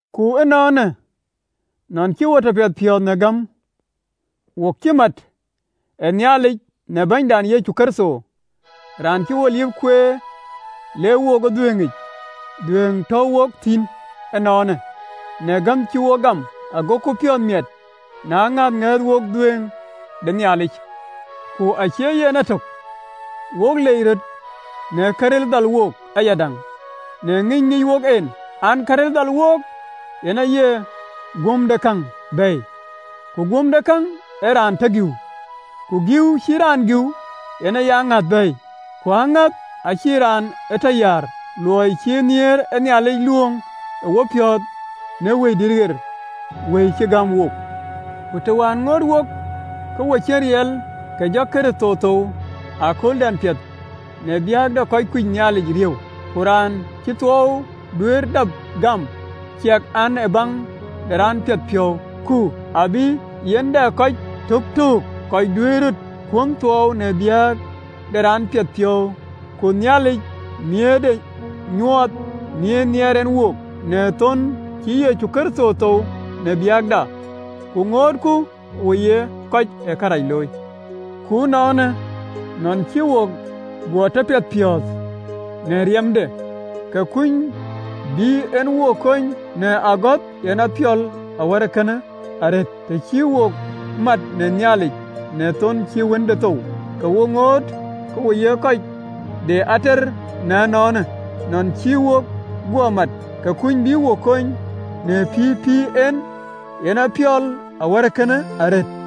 Ku ënɔɔnë, nɔn cï wo tɔ piɛthpiɔ̈ɔ̈th në gäm, wok cï mat ë Nhialic në Bɛ̈nydan Yecu Kërtho. Raan cï wo liëp kueer le wook ë dhuëëŋic dhuëëŋ tɔ̈u wok thïn ënɔɔnë, në gäm cï wok gam, agoku piɔ̈ɔ̈th miɛt në ŋäth ŋɛ̈ɛ̈th wok dhuëëŋ de Nhialic. Ku acie yen etök, wok lec röt në karil dhal wook ayadäŋ, në ŋïny ŋic wok en an, karil dhal wook, yen aye guömdekäŋ bɛ̈ɛ̈i, ku guömdekäŋ ee raan tɔ gïu, ku gïu cï raan gïu yen aye aŋäth bɛ̈ɛ̈i, ku aŋäth acïï raan ë tɔ yäär, luɔi cï nhiëër ë Nhialic luööŋ ë wopiɔ̈ɔ̈th në Wëidït ɣer cï gäm wook. Ku të wään ŋoot wok ke wok cïn riɛl, ke Kërtho ë jɔ thou ëkööldɛn piɛth në biäk de kɔc kuc Nhialic riëëu. Ku raan acïï thuɔɔu duëër dap gam, ciɛk an, ee baŋ de raan piɛthpiɔ̈u, ku abï yiɛ̈n dɛ kɔc töktöök kɔc duëër röt kuɔn thuɔɔu në biäk de raan piɛthpiɔ̈u. Ku Nhialic ë nhiëërde nyuɔɔth, nhiëër nhiɛɛr en wook, në thon cï Yecu Kërtho thou në biäkda, ku ŋootku ë wo ye kɔc ë kërac looi. Ku ënɔɔnë, nɔn cï wo guɔ tɔ piɛthpiɔ̈ɔ̈th në riɛmde, ke kuny bï en wo kony në agɔ̈th yen apiɔl awär ee kënë arëët. Të cï wo määt në Nhialic në thon cï Wënde thou, ke wo ŋoot ë wo ye kɔc de ater, na ënɔɔnë, nɔn cï wo guɔ määt, ke kuny bï ë wo kony në pïïr pïïr en, yen apiɔl awär ee kënë arëët.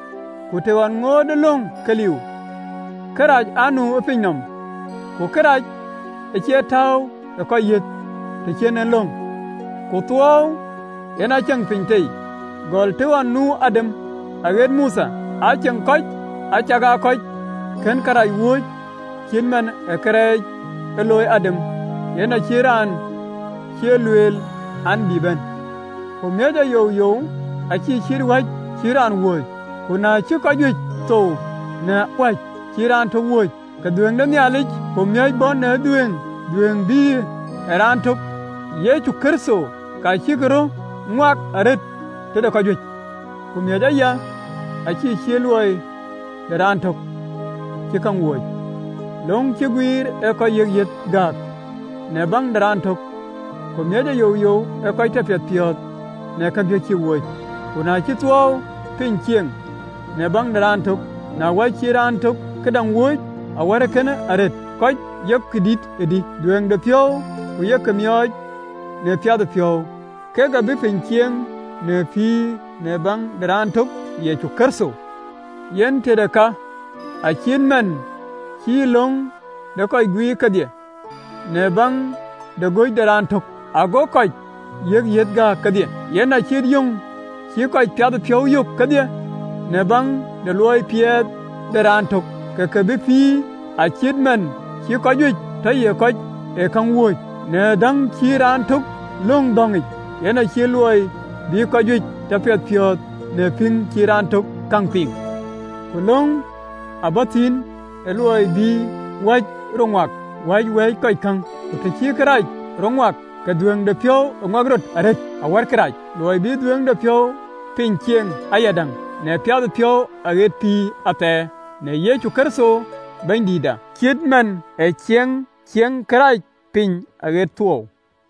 Ku të ɣɔn ŋootë löŋ ke liu, kërac aa nu ë piny nɔm, ku kërac acie tääu ë kɔc yiëth të cïn en löŋ. Ku thuɔɔu yen aa ceŋ piny tei, gɔl të ɣɔn nu Adam ɣeet ë Mothe, aa ceŋ kɔc acakaa kɔc kën kërac wööc cït man ë kërɛɛc ë looi Adam, yen acït raan cï lueel an, bï bɛ̈n. Ku miɔc youyou acïï cït wäc cï raan wööc. Ku na cï kɔc juëc thou në wäc cïï raan tök wööc, ke dhuëëŋ de Nhialic ku miɔ̈c bɔ̈ në dhuëëŋ, dhuëëŋ bïïyë raan tök, Yecu Kërtho, ka cïk röt ŋuak arëët tëde kɔc juëc. Ku miɔ̈c aya, acïï cït luɔi de raan töŋ cï kërac looi. Löŋ cï guiir ë kɔc yiëk yiëth gääk në baŋ de raan tök, ku miɔ̈c youyou ee kɔc tɔ piɛth piɔ̈ɔ̈th në kajuëc cïk wööc. Ku na cï thuɔɔu piny cieŋ në baŋ de raan tök, në wäc cï raan tök këdäŋ wööc, awär kënë arëët, kɔc yök dït de dhuëëŋdepiɔ̈u ku yeke miɔɔc në piathëpiɔ̈u, kek abï piny cieŋ në pïïr në baŋ de raan tök, Yecu Kërtho. Yen tëde ka, acït man cï löŋ de kɔc guiir kedhie, në baŋ de göc de raan tök, ago kɔc yiëk yiëth gääk kedhie, yen acït yöŋ cï kɔc piathëpiɔ̈u yök kedhie në baŋ de luɔi piɛth de raan tök, ke ke bï pïïr. Acït man cï kɔc juëc tɔ ye kɔc ë käŋ wööc në dhäŋ cï raan tök löŋ dhɔ̈ŋic, yen acït luɔi bï kɔc juëc tɔ piɛthpiɔ̈ɔ̈th në pïŋ cï raan tök käŋ piŋ. Ku löŋ aa bɔ̈ thïn, ë luɔi bï awäc rɔt ŋuak awäny wɛ̈ɛ̈cë kɔc käŋ, ku të cï kërac rɔt ŋuak, ke dhuëëŋdepiɔ̈u ë ŋuak rɔt arëët awär kërac, luɔi bï dhuëëŋdepiɔ̈u piny cieŋ ayadäŋ në piathëpiɔ̈u aɣet pïïr athɛɛr në Yecu Kërtho Bɛ̈nydïïtda, cït man cï ciɛɛŋ cieŋë kërac piny aɣet thuɔɔu.